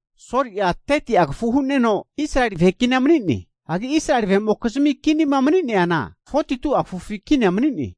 Soli'a 30'a kafu hu'neno Israeli vahe kinia mani'ne. Hagi Israeli vahe'mokizmi kinima mani'neana 42'a kafufi kinia mani'ne.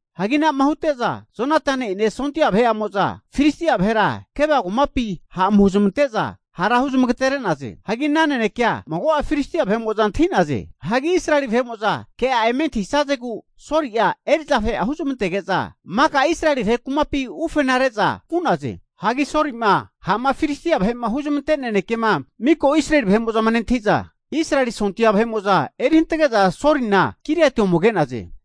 Hagi anama hute'za Jonatani'ene sondia vahe'amo'za Filistia vahera Geba kumapi ha' ome huzamante'za hara huzamagatere'naze. Hagi ana nanekea mago'a Filistia vahe'mo'za antahi'naze. Hagi Israeli vahe'mo'za ke'a eme antahisazegu, Soli'a eri'za vahe'a huzamantege'za maka Israeli vahe kumapi ufenare'za vu'naze. Hagi Soli'ma ha'ma Filistia vahe'ma huzmante nanekema miko Israeli vahe'mo'za nentahi'za, Israeli sondia vahe'mo'za eri hantage'za Solina Giliati ome age'naze.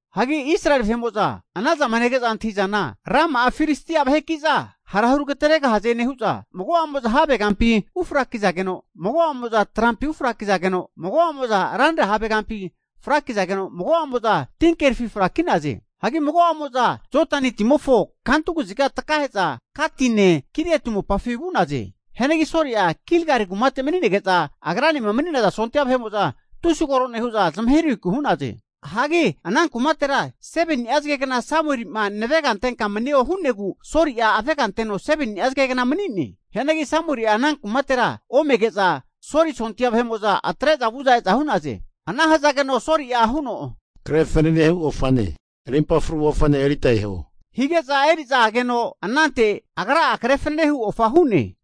Hagi Israeli vahe'mo'za anazama nege'za antahi'zana, rama'a Filistia vaheki'za hara huragateregahaze'ma nehu'za, mago'amo'za havegampi ufrakizageno, mago'amo'za trampi ufrakizageno, mago'amo'za ranra havegampi frakizageno, mago'amo'za tinkerifi fraki'naze. Hagi mago'amo'za Jodani timofo kantu kaziga takahe'za Gatine Giliati mopafi vu'naze. Hianagi Soli'a Gilgali kumate mani'nege'za agranema mani'naza sondia vahe'mo'za tusi koro nehu'za zamahirahiku hu'naze. Hagi ana kumatera 7ni'a zagegna Samuelima navega antenka manio hu'negu Soli'a avega anteno 7ni'a zagegna mani'ne. Hianagi Samueli'a ana kumatera omege'za Soli sondia vahe'mo'za atre'za vu'za e'za hu'naze. Ana hazageno Soli'a huno, Kre fananehu ofane rimpa fru ofane erita eho, hige'za eri'za ageno, anante agra'a kre fanane hu ofa hu'ne.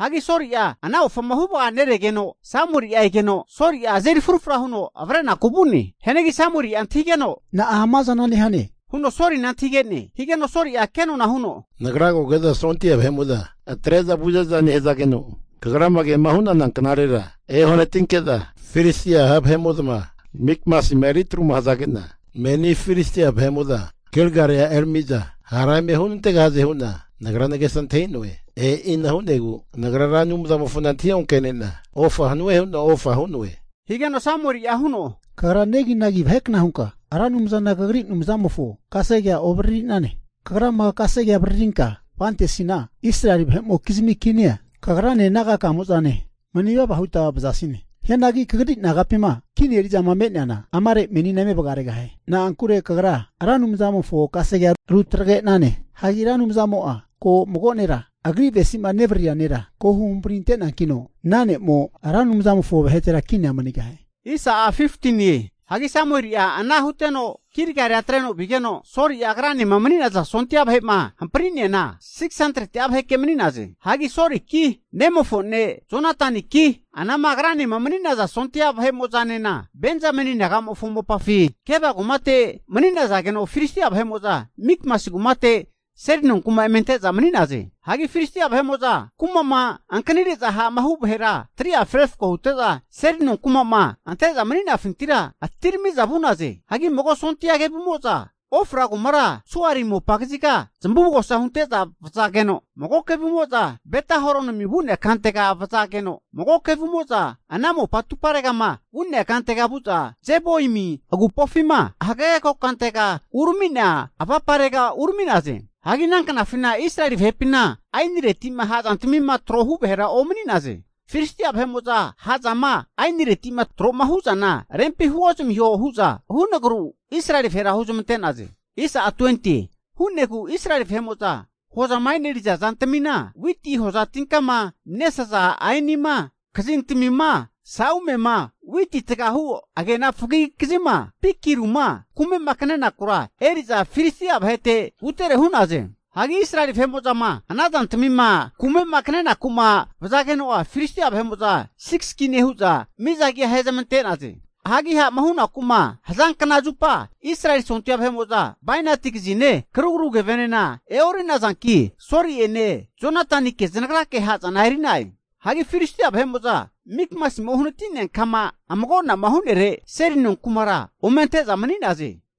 Hagi Soli'a ana ofama huvaneregeno, Samueli'a egeno Soli'a azeri frufra huno avrenaku vu'ne. Hianagi Samueli'a antahigeno, Na'a amazana nehane, huno Solina antahige'ne. Higeno Soli'a kenona huno, Nagra koge'za sondia vahe'mo'za atre'za vu'za e'za nehazageno, kagra kema hu'nana knarera eohanatinke'za, Filistia ha' vahe'mo'zama Mikmasima eri atruma hazage'na, meni Filistia vahe'mo'za Gilgalia erami'za hara eme hunantegahaze hu'na nagra nagesa antahi'noe. E'ina hu'negu nagra'a Ra Anumzamofona antahi onke'nena ofa hanue hu'na ofa hu'noe. Higeno Samueli'a huno, Kagra neginagi vahekna hunka Ra Anumzana kagri Anumzamofo kasege'a ovaririne. Kagrama kasege'a avaririnka vantesina, Israeli vahe'mokizmi kinia kagrane naga'kamo'zane manivava huta vazasine. Hianagi kagri nagapima kini eri'zama me'neana amare menina eme vagaregahie. Na'ankure kagra Ra Anumzamofo kasegea rutagre'nane. Hagi Ra Anumzamo'a ko mago nera Agri avesizama nevariria nera ko huhampri ante'neankino, ana ne'mo Ra Anumzamofo vahetera kinia manigahie. Hagi Samueli'a ana huteno Gilgalia atreno vigeno, Soli'a agranema mani'naza sondia vahe'ma hampriana 600'a vaheke mani'naze. Hagi Soliki nemofo ne' Jonataniki, anama agranema mani'naza sondia vahe'mo'zanena Benzameni naga'mofo mopafi Geba kumate mani'nazageno, Filistia vahe'mo'za Mikmasi kumate seli nonku'ma eme ante'za mani'naze. Hagi Filistia vahe'mo'za kuma'ma ankanire'za ha'ma hu vahera 3'afi refako hute'za, seli nonkuma'ma ante'za mani'nafintira atirami'za vu'naze. Hagi mago sondia kevumo'za Ofra kumara Suali mopa kaziga zamavugosa hunte'za vazageno, mago kevumo'za Beta Horonima vu'nea kantega vazageno, mago kevumo'za ana mopa atuparegama vu'nea kantega vu'za Zeboimi agupofima hagage kokantega urami'nea avaparega urami'naze. Hagi ana knafina Israeli vahepina aenireti'ma ha'zantamima trohu vahera omani'naze. Filistia vahe'mo'za ha'zama aeniretima tro'ma hu'zana rempi huozamiho hu'za hunagru Israeli vahera huzmante'naze. Hu'negu Israeli vahe'mo'za hozama e'neri'za zantamina, witi hoza tinkama nesaza aenima, kazintamima, sa'umema, witi tagahu agena fagigi kazima, pikiruma kume'ma kanenakura, eri'za Filistia vahete vutere hu'naze. Hagi Israeli vahe'mo'zama ana zantamima kume'ma kanenakuma vazageno'a, Filistia vahe'mo'za 6gis kine hu'za miza agi ahezamante'naze. Hagi ha'ma hunaku'ma hazankna zupa Israeli sondia vahe'mo'za bainati kazine karugru kevenena e'ori'nazanki Soli'ene Jonatanike zanagrake ha'zana e'ri'na'e. Hagi Filistia vahe'mo'za Mikmasima uhanati'nea kama amago'nama hu'nere seli nonkumara ome ante'za mani'naze.